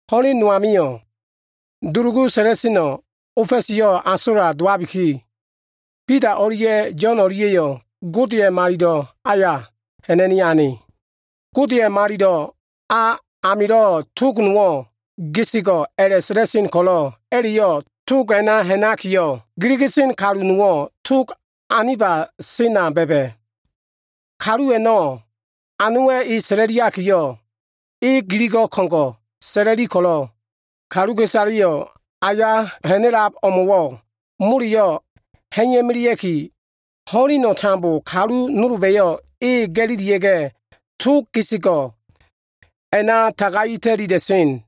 Ho꞉len no amio꞉, dulugu sa꞉la꞉seno꞉ ofa꞉siyo꞉ asola dowabiki, Bida o꞉lia꞉ Yo꞉n o꞉lia꞉yo꞉ Godeya꞉ malilo꞉ aya ha꞉na꞉ni ane. Godeya꞉ malilo꞉ a amilo꞉ tog nowo꞉ “Tog Nafale” a꞉la꞉sa꞉la꞉sen ko꞉lo꞉, a꞉la꞉yo꞉ tog a꞉na ha꞉nakiyo꞉, giligisen kalu nowo꞉ tog aniba sena ba꞉ba꞉. Kalu a꞉no꞉ anowa꞉ e sa꞉la꞉liakiyo꞉, e giligo꞉ ko꞉ngo꞉ sa꞉la꞉li ko꞉lo꞉, kaluka꞉isaleyo꞉ a usamilo꞉ ti ha꞉na꞉lab o꞉mo꞉wo꞉ moleyo꞉ ha꞉iya꞉melea꞉ki, ho꞉leno꞉ tambo kalu nolba꞉yo꞉ e ga꞉lilia꞉ga꞉, Tog Nafale a꞉na tagai ta꞉lila꞉sen.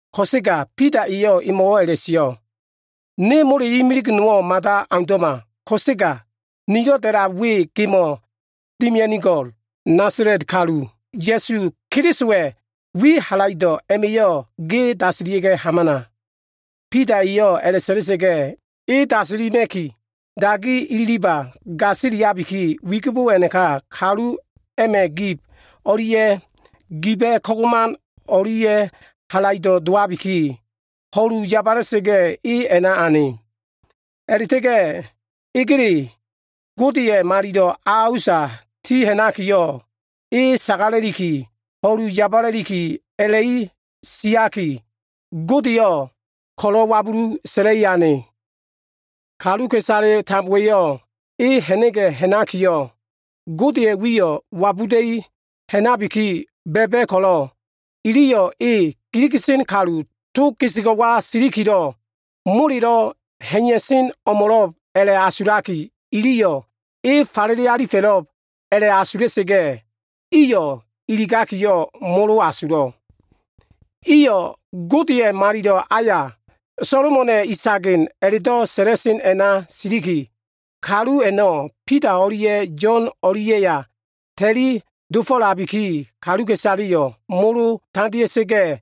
Ko꞉sega Bida eyo꞉ emo꞉wo꞉ a꞉la꞉sio꞉, “Ne mole imilig nowo꞉ mada aundo꞉ma ko꞉sega, nilo꞉ da꞉lab we gemo꞉ dimia꞉nigo꞉l. Nasala꞉t kalu, Ya꞉su Kelisowa꞉ wi halaido꞉ a꞉na ilikiyo꞉, ge dasilia꞉ga꞉ hamana!” Bida eyo꞉ a꞉la꞉sa꞉la꞉sa꞉ga꞉, e dasilima꞉ki, dagi ililiba꞉ gasiliabiki, wigibo a꞉naka kalu a꞉ma꞉ gib o꞉lia꞉ giba꞉ kagoman o꞉lia꞉yo꞉ halaido꞉ dowabiki, ho꞉lu ya꞉ba꞉sa꞉ga꞉ e a꞉na ane. A꞉la꞉ta꞉ga꞉ egele Godeya꞉ malilo꞉ a usa ti ha꞉nakiyo꞉, e sagala꞉liki, ho꞉lu yabala꞉liki a꞉la꞉i siaki, Godeyo꞉ ko꞉lo꞉ wabulu sa꞉la꞉li ane. Kaluka꞉isale tambowa꞉yo꞉ e ha꞉na꞉ga꞉ ha꞉nakiyo꞉, Godeya꞉ wiyo꞉ wabuda꞉i ha꞉nabiki ba꞉ba꞉ ko꞉lo꞉, iliyo꞉ e giliga꞉sen kalu Tog Nafaleya silikilo꞉ molelo꞉ ha꞉iya꞉sen o꞉mo꞉lo꞉b a꞉la꞉asulakiyo꞉, iliyo꞉ e falele alifa꞉lo꞉b a꞉la꞉asula꞉sa꞉ga꞉, iyo꞉ iligakiyo꞉ molo asulo꞉. Iyo꞉ Godeya꞉ Malilo꞉ aya, “Solomona꞉ Isagen” a꞉la꞉do꞉ sa꞉la꞉sen a꞉na siliki, kalu a꞉no꞉ Bida o꞉lia꞉ Yo꞉n o꞉lia꞉ya ta꞉li dofo꞉labikiyo꞉, kaluka꞉isaleyo꞉ molo tandea꞉sa꞉ga꞉,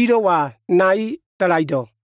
ilo꞉wa nai dalaido꞉.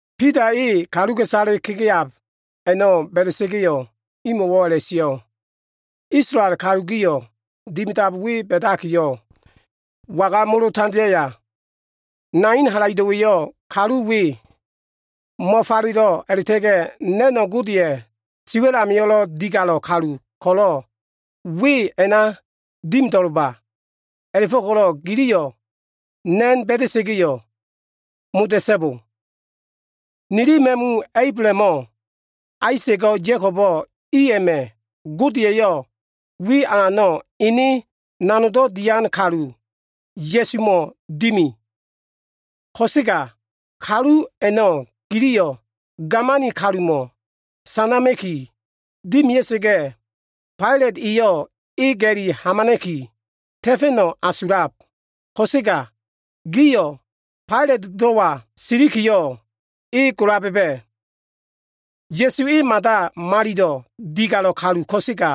Bida e kaluka꞉isale kegeab a꞉no꞉ ba꞉da꞉sa꞉ga꞉yo꞉, imo꞉wo꞉ a꞉la꞉sio꞉, “Isolael kalu gio꞉, dimidab we ba꞉dakiyo꞉, waga molo tandeaya? Nanin halaido꞉wa꞉yo꞉ kalu we mo꞉falelo꞉ a꞉la꞉ta꞉ga꞉ na꞉no꞉ Godeya꞉ siwa꞉l amio꞉lo꞉ digalo꞉ kalu ko꞉lo꞉ we a꞉na dimido꞉lba. A꞉la꞉fo꞉ko꞉lo꞉ giliyo꞉ na꞉no꞉ ba꞉da꞉sa꞉ga꞉yo꞉ moda꞉so꞉bo. Nili ma꞉mu Ablahamo꞉, Aisa꞉go꞉, Ya꞉kobo꞉ i a꞉ma꞉ Gode eyo꞉ wi alano꞉ Ene Nanogdo꞉ Dian kalu, Ya꞉sumo꞉ dimi. Ko꞉sega kalu a꞉no꞉ giliyo꞉ gamani kalumo꞉ sanama꞉ki dimia꞉sa꞉ga꞉, Failat eyo꞉ e ga꞉li hamana꞉ki ta꞉fa꞉no꞉ asulab, ko꞉sega gio꞉ Failatdo꞉wa silikiyo꞉ e gola ba꞉ba꞉. Ya꞉su e mada malilo꞉ digalo꞉ kalu ko꞉sega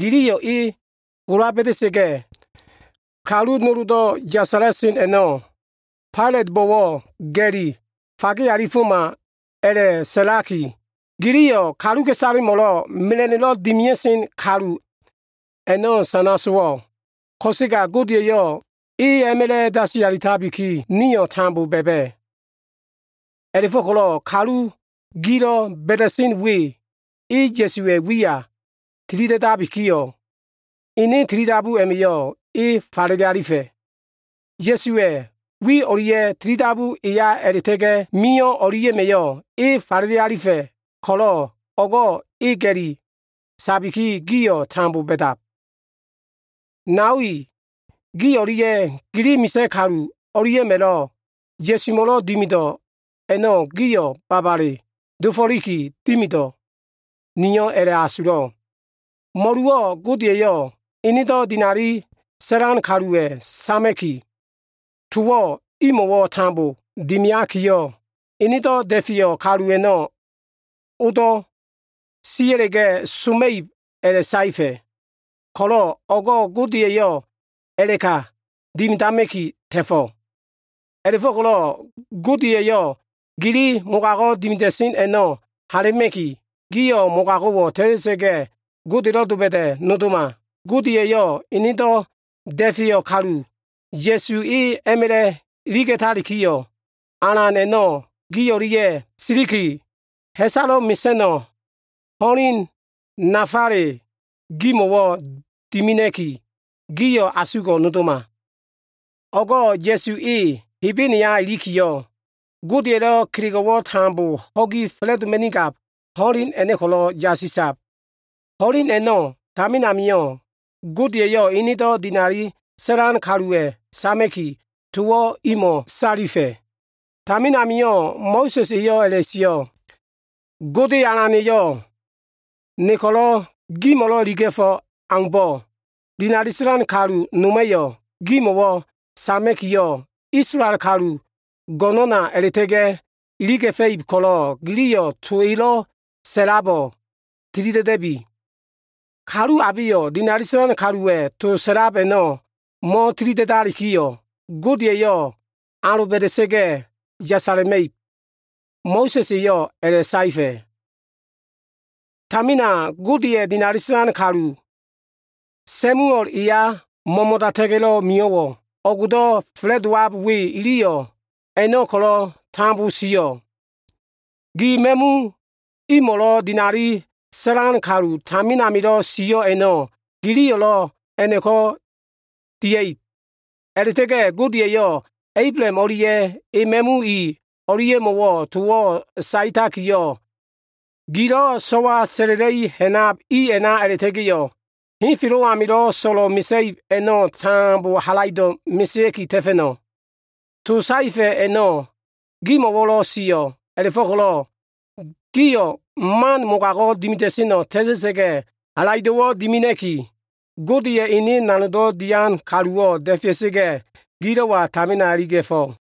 giliyo꞉ e gola ba꞉da꞉sa꞉ga꞉, kalu noldo꞉ yasala꞉sen a꞉no꞉ Failatbo꞉wo꞉ ga꞉li fagega꞉foma a꞉la꞉sa꞉laki, giliyo꞉ kaluka꞉isalemo꞉lo꞉ mela꞉no꞉lo꞉ dimia꞉sen kalu a꞉no꞉ sana sowo꞉. Ko꞉sega Gode eyo꞉ e a꞉ma꞉la꞉ dasi alitabikiyo꞉, nio꞉ tambo ba꞉ba꞉. A꞉la꞉fo꞉ko꞉lo꞉ kalu gilo꞉ ba꞉da꞉sen we, e Ya꞉suwa꞉ wiya tilida꞉dakiyo꞉, ene tilidabu a꞉ma꞉yo꞉ e falele alifa꞉. Ya꞉suwa꞉ wi o꞉lia꞉, tilidabu eya a꞉la꞉ta꞉ga꞉lo꞉ mio꞉ o꞉lia꞉ma꞉yo꞉ e falele alifa꞉ ko꞉lo꞉ o꞉go꞉ e ga꞉li sabikiyo꞉, gio꞉ tambo ba꞉dab. “Nao i, gi o꞉lia꞉ gili misa꞉ kalu o꞉lia꞉ma꞉lo꞉ Ya꞉sumo꞉lo꞉ dimido꞉ a꞉no꞉ gio꞉ babale dofo꞉liki dimido꞉, niyo꞉ a꞉la꞉asulo꞉. Mo꞉luwo꞉ Gode eyo꞉ enedo꞉ dinali sa꞉lan kaluwa꞉ sama꞉ki, towo꞉ imo꞉wo꞉ tambo dimiakiyo꞉, Enedo꞉ da꞉feyo꞉ kalu a꞉no꞉ odo꞉ sia꞉la꞉ga꞉ soma꞉ib a꞉la꞉saefa꞉ ko꞉lo꞉, o꞉go꞉ Gode eyo꞉ a꞉la꞉ka dimidama꞉ki ta꞉fo꞉. A꞉la꞉fo꞉ko꞉lo꞉ Gode eyo꞉ gili mogago꞉ dimida꞉sen a꞉no꞉ hala꞉ma꞉ki, gio꞉ mogago꞉wo꞉ ta꞉ta꞉sa꞉ga꞉, Godelo꞉loba꞉da꞉ nodoma. Gode eyo꞉ Enedo꞉ da꞉feyo꞉ kalu, Ya꞉su E a꞉ma꞉la꞉ iliga꞉talikiyo꞉, Alan a꞉no꞉ gi o꞉lia꞉ siliki, ha꞉salo꞉ mesa꞉no꞉ ho꞉len nafale a꞉no꞉ gimo꞉wo꞉ dimina꞉ki, gio꞉ asugo꞉ nodoma. O꞉go꞉ Ya꞉su E Hebene ilikiyo꞉, Godeya꞉lo꞉ kelego꞉wo꞉ tambo ho꞉gi fa꞉la꞉doma꞉nigab ho꞉len a꞉no꞉ ko꞉lo꞉ yasisab. Ho꞉len a꞉no꞉ tamin amio꞉ Gode eyo꞉ Enedo꞉ dinali sa꞉lan kaluwa꞉ sama꞉ki, towo꞉ imo꞉ salifa꞉. Tamin amio꞉ Mo꞉sa꞉s eyo꞉ a꞉la꞉sio꞉, ‘Gode Alana꞉yo꞉ ne ko꞉lo꞉ gimo꞉lo꞉ iliga꞉fo꞉ aumbo꞉, dinali sa꞉lan kalu noma꞉yo꞉ gimo꞉wo꞉ sama꞉kiyo꞉, Isolael kalu go꞉no꞉na a꞉la꞉ta꞉ga꞉ iliga꞉fa꞉ib ko꞉lo꞉, giliyo꞉ to elo꞉ sa꞉labo꞉ tilida꞉da꞉bi. Kalu abeyo꞉ dinali sa꞉lan kaluwa꞉ to sa꞉lab a꞉no꞉ mo꞉tilida꞉dalikiyo꞉, Gode eyo꞉ aloba꞉da꞉sa꞉ga꞉ yasala꞉ma꞉ib.’ Mo꞉sa꞉s eyo꞉ a꞉la꞉saefa꞉. “Tamina Godeya꞉ dinali sa꞉lan kalu, Samuel eya mo꞉mo꞉data꞉ga꞉lo꞉ mio꞉wo꞉, o꞉go꞉do꞉ fa꞉la꞉dowab we iliyo꞉ a꞉no꞉ ko꞉lo꞉ tambo sio꞉. Gi ma꞉mu imo꞉lo꞉ dinali sa꞉lan kalu tamin amilo꞉ sio꞉ a꞉no꞉, giliyo꞉lo꞉ a꞉no꞉ko꞉ dia꞉ib. A꞉la꞉ta꞉ga꞉ Gode eyo꞉ Ablaham o꞉lia꞉ e ma꞉mui o꞉lia꞉mo꞉wo꞉ towo꞉ saetakiyo꞉, ‘Gilo꞉ so꞉wa sa꞉la꞉la꞉i ha꞉nab i a꞉na a꞉la꞉ta꞉ga꞉yo꞉, henfelo꞉ amilo꞉ so꞉lo꞉ mesa꞉ib a꞉no꞉ tambo halaido꞉ mesea꞉ki ta꞉fa꞉no꞉.’ To saefa꞉ a꞉no꞉ gimo꞉wo꞉lo꞉ sio꞉. A꞉la꞉fo꞉ko꞉lo꞉ gio꞉ man mogago꞉ dimida꞉seno꞉ ta꞉ta꞉sa꞉ga꞉, halaido꞉wo꞉ dimina꞉ki, Godeya꞉ Ene nanogdo꞉ dian kaluwo꞉ da꞉fea꞉sa꞉ga꞉, gilo꞉wa tamina iliga꞉fo꞉.”